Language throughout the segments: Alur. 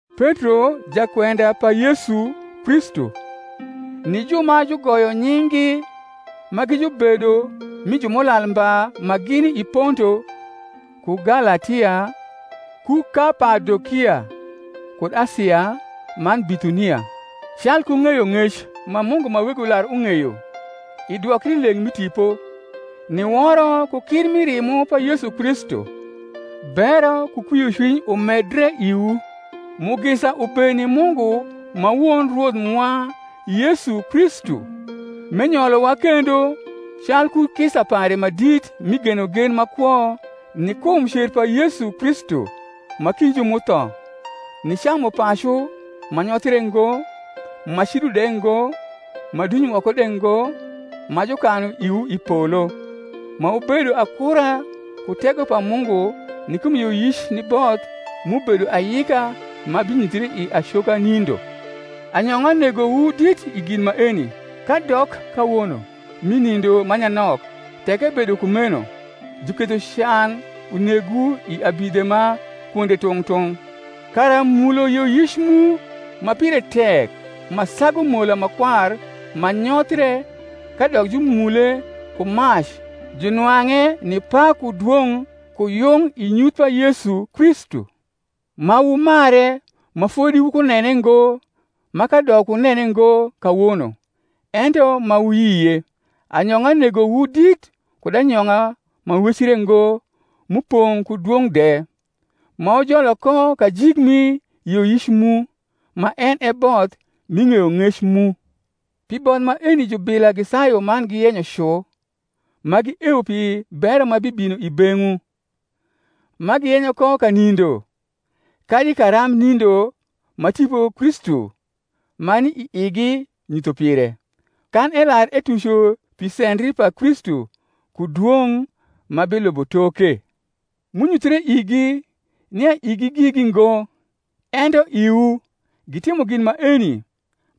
Petro, jakwenda pa Yesu Kristu, ni ju ma jugoyo nying’gi ma gi jubedo uii Jumulal mba ma gini i Ponto, ku Galatia, ku Kapadokia, kud Asia, man Bithuni, calku ng’eyong’ec ma Mungu ma Wego lar ung’eyo, i dwokrileng’ mi Tipo, ni woro ku kir mi rimo pa Yesu Kristu: Bero ku kwiocwiny umedre iwu. Mugisa ubed ni Mungu ma Won Rwoth mwa Yesu Kristu, menyolowa kendo calku kisa pare ma dit mi genogen ma kwo ni kum cer pa Yesu Kristu ma kind ju m’utho, ni camupacu ma nyothre ngo, ma cido de ngo, ma duny woko de ngo, ma jukanu iwu i polo, ma wubedo akura ku tego pa Mungu ni kum yioyic ni both m’ubedo ayika ma binyuthre i acoka nindo. Anyong’a negowu dit i gin maeni, kadok kawono mi nindo ma nyanok, tek ebedo kumeno, juketho can unegwu i abidhe ma kwonde tung’ tung’, kara mulo yioyic mu, ma pire tek ma sagu mola ma kwar ma nyothie kadok jumule ku mac, junwang’e ni pak ku dwong’ ku yung i nyuth pa Yesu Kristu: ma wumare, ma fodi wukunene ngo; ma kadok wunene ngo kawono, ento ma wuyie, anyong’a negowu dit kud anyong’a mawecre ngo m’upong’ ku dwong’ de; ma wujolo ko kajik mi yioyic mu, ma en e both mi ng’eyong’ec mu. Pi both maeni jubila gisayu man giyenyo cu, ma giewo pi bero ma bibino i beng’wu: ma giyenyo ko kanindo kadi karambnindo ma Tipo Kristu ma ni i igi nyutho pire, kan elar etuco pi sendri pa Kristu, ku dwong’ ma bilubo toke. M’unyuthre igi, nia igi gigi ngo, ento iwu, gitimo gin maeni,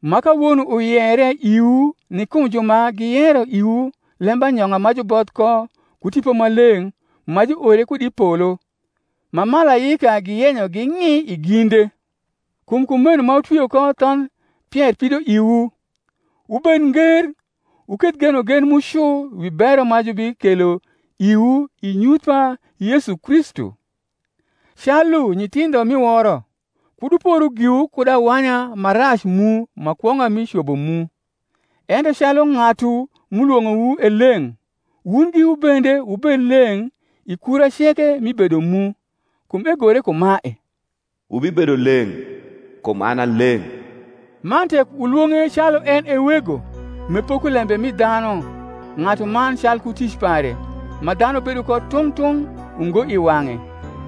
ma kawono uyere iwu ni kum ju ma giyero iwu lembanyong’a ma juboth ko ku Tipo Maleng’ ma juore kud i polo; ma malaika giyenyo ging’i i ginde. Kum kumeno ma wutwio ko thondh pier pidoiwu, wubed nger, wuketh genogen mu cu wi bero ma jubikelo iwu i nyuth pa Yesu Kristu; calu nyithindho mi woro, kud wuporu giwu kud awanya ma rac mu ma kwong’a mi cobo mu; ento calu ng’atu m’ulwong’owu e leng’, wun giwu bende wubed leng’ i kura ceke mi bedo mu; kum egore kumae, Wubibedo leng’; kum an a leng’. Man tek wulwong’e calu en e Wego, m’epoko lembe mi dhanu ng’atuman calku tic pare ma dhanu bedo ko tung’ tung’ ungo i wang’e,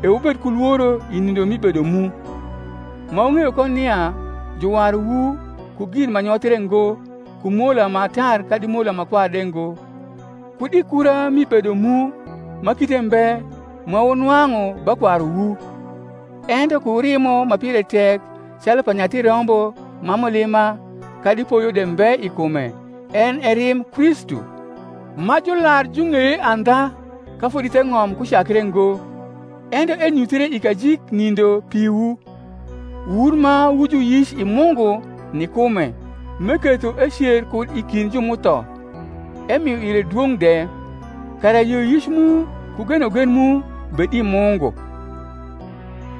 e wubed ku lworo i nindo mi bedo mu: ma wung’eyo ko nia juwaruwu, ku gin ma nyothre ngo, ku mola ma tar kadi mola ma kwar de ngo, kud i kura mi bedo mu ma kite mbe ma wunwang’u ba kwaruwu; ento ku rimo ma pire tek, calu pa nyathi rombo ma mulima kadi poyo de mbe i kume, en e rimb Kristu: ma jular jung’eye andha ka fodi theng’om kucakre ngo, ento enyuthre i kajiknindo piwu, wun ma wu juyic i Mungu ni kume, m’eketho ecer kud i kind ju m’utho, emio ire dwong’ de; kara yioyic mu ku genogen mu bed i Mungu.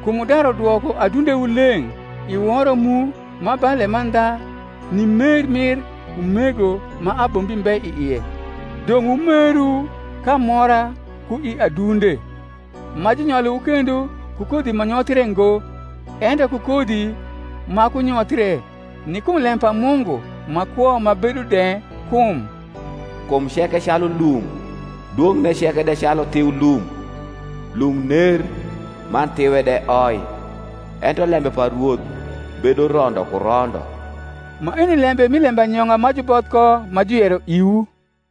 Kum wudaru dwoko adundewu leng’ i woro mu ma ba lemandha ni mer mir umego ma abombi mbe i ie, dong’ wumeru k’amora ku i adunde: ma junyolowu kendo ku kodhi ma nyothre ngo, ento ku kodhi ma kunyothie, ni kum lem pa Mungu, ma kwo ma bedo de. Kum, Kum ceke calu lum, Dwong’ne ceke de calu thiu lum. Lum ner, man thiwe de oi: Ento lembe pa Rwoth bedo rondo ku rondo. Maeni lembe mi lembanyong’a ma juboth ko ma juyero iwu.